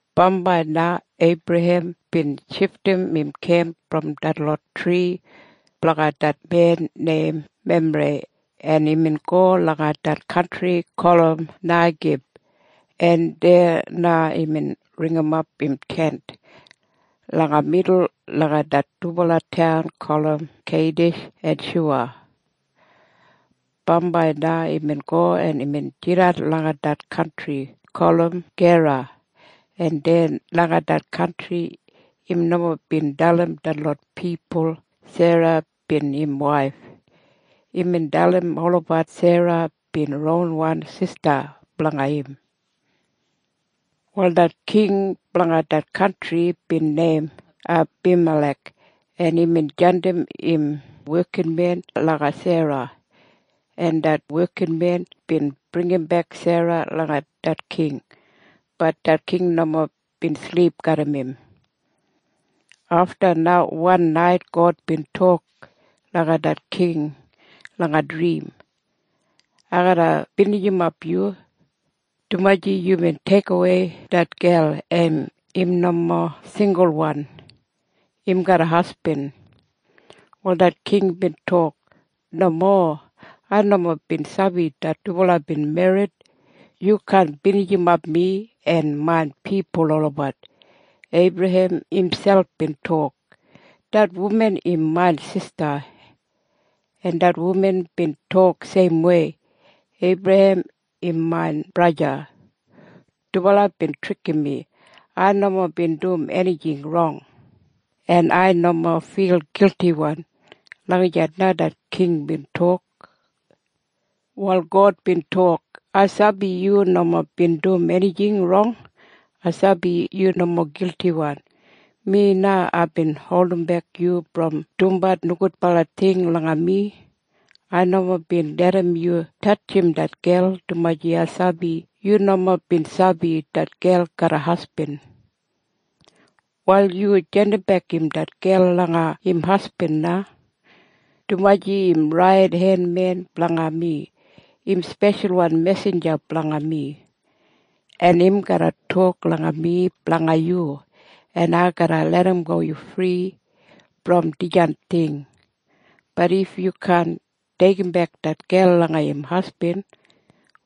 Bambai na Eibrahem bin shifdim im kemp brom detlot tri blanga det men neim Memrei, en imbin go langa det kantri gulum Neigib, en deya na imbin ringimap im tent langa midul langa det dubala taun gulum Keidish en Shuya. Bambai na imbin go en imbin jidan langa det kantri gulum Gera, en deya langa det kantri im nomo bin dalim detlot pipul Sera bin im waif. Imbin dalim olabat Sera bin ronwan sista blanga im. Wal det king blanga det kantri bin neim Abimalek, en imbin jandim im wekinmen langa Sera, en imbin deigimbek Sera langa det king. Bat det king nomo bin silip garram im. Afta na wan nait God bin tok langa det king langa drim, “Ai garra binijimap yu, dumaji yubin deigimwei det gel, en im nomo singulwan. Im garram hasbin.” Wal det king bin tok, “Nomo! Ai nomo bin sabi det dubala bin merrit. Yu kaan binijimap mi en main pipul olabat. Eibrahem imselp bin tok, ‘Det wuman im main sista’, en det wuman bin tok seimwei, ‘Eibrahem im main braja.’ Dubala bin trikim mi. Ai nomo bin dum enijing rong. En ai nomo fil giltiwan.” Lagijat na det king bin tok. Wal God bin tok, “Ai sabi yu nomo bin dum enijing rong. Ai sabi yu nomo giltiwan. Mi na aibin holdimbek yu brom dumbat nogudbala ting langa mi. Ai nomo bin larram yu tatjim det gel, dumaji ai sabi yu nomo bin sabi det gel garram hasbin. Wal yu jandimbek det gel langa im hasbin na, dumaji im raidenmen blanga mi. Im speshalwan mesinja blanga mi, en im garra tok langa mi blanga yu, en ai garra larramgo yu fri brom dijan ting. Bat if yu kaan deigimbek det gel langa im hasbin,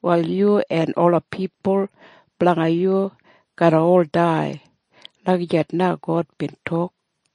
wal yu en ola pipul blanga yu garra ol dai.” Lagijat na God bin tok.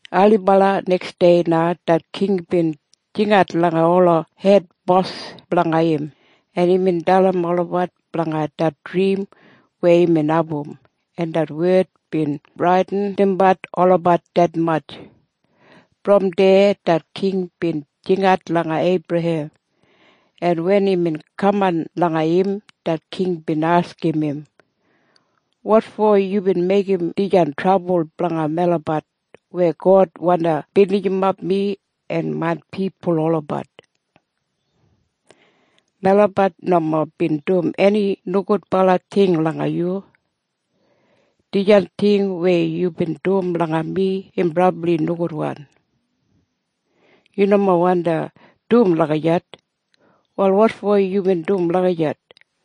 Ailibala neksdei na det king bin jingat langa ola hedbos blanga im, en imbin dalim olabat blanga det drim weya imbin abum, en det wed bin bradinimbat olabat detmatj. Brom deya det king bin jingat langa Eibrahem, en wen imbin kaman langa im, det king bin askim im, “Wotfo yubin meigim dijan trabul blanga melabat weya God wandi binijimap mi en main pipul olabat? Melabat nomo bin dum eni nogudbala ting langa yu. Dijan ting weya yubin dum langa mi im brabli nogudwan. Yu nomo wandi dum lagijat. Wal wotfo yubin dum lagijat?”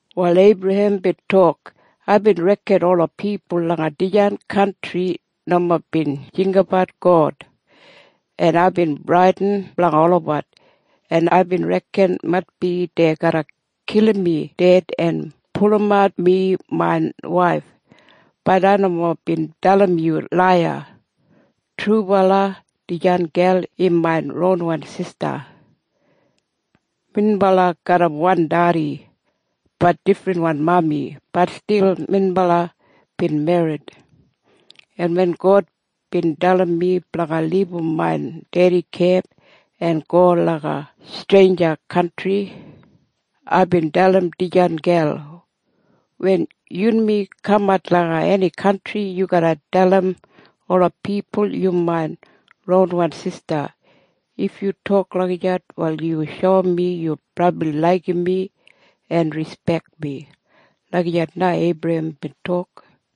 Wal Eibrahem bin tok, “Aibin reken ola pipul langa dijan kantri nomo bin jinggabat God, en aibin bradin blanga olabat, en aibin reken maitbi dei garra kilim mi ded en pulumat mi main waif. Bat ai nomo bin dalim yu laiya. Trubala dijan gel im main ronwan sista. Minbala garram wan dedi, bat difrinwan mami. Bat stil minbala bin merrit. En wen God bin dalim mi blanga libum main dedi kemp en go langa streinja kantri, aibin dalim dijan gel, ‘Wen yunmi kamat langa eni kantri, yu garra dalim ola pipul yu main ronwan sista. If yu tok lagijat, wal yu shoum mi yu brabli laigim mi en rispek mi.’” Lagijat na Eibrahem bin tok.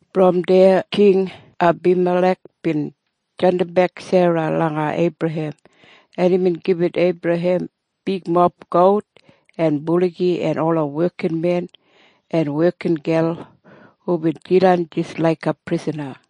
Brom deya King Abimalek bin jandimbek Sera langa Eibrahem, en imbin gibit Eibrahem bigmob gout en buligi en ola wekinmen en wekingel hubin jidan jis laiga prisana,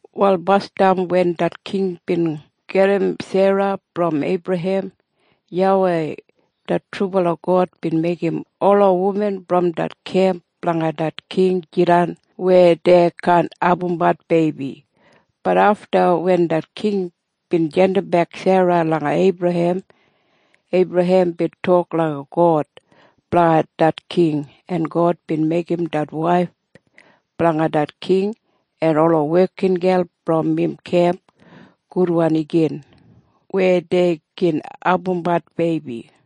Wal basdam wen det king bin gajim Sera brom Eibrahem, YAWEI det trubala God bin meigim ola wuman brom det kemp blanga det king jidan weya dei kaan abumbat beibi. Bat afta wen det king bin jandimbek Sera langa Eibrahem, Eibrahem bin tok langa God blanga det king, en God bin meigim det waif blanga det king en ola wekingel brom im kemp gudwan igin weya dei gin abumbat beibi.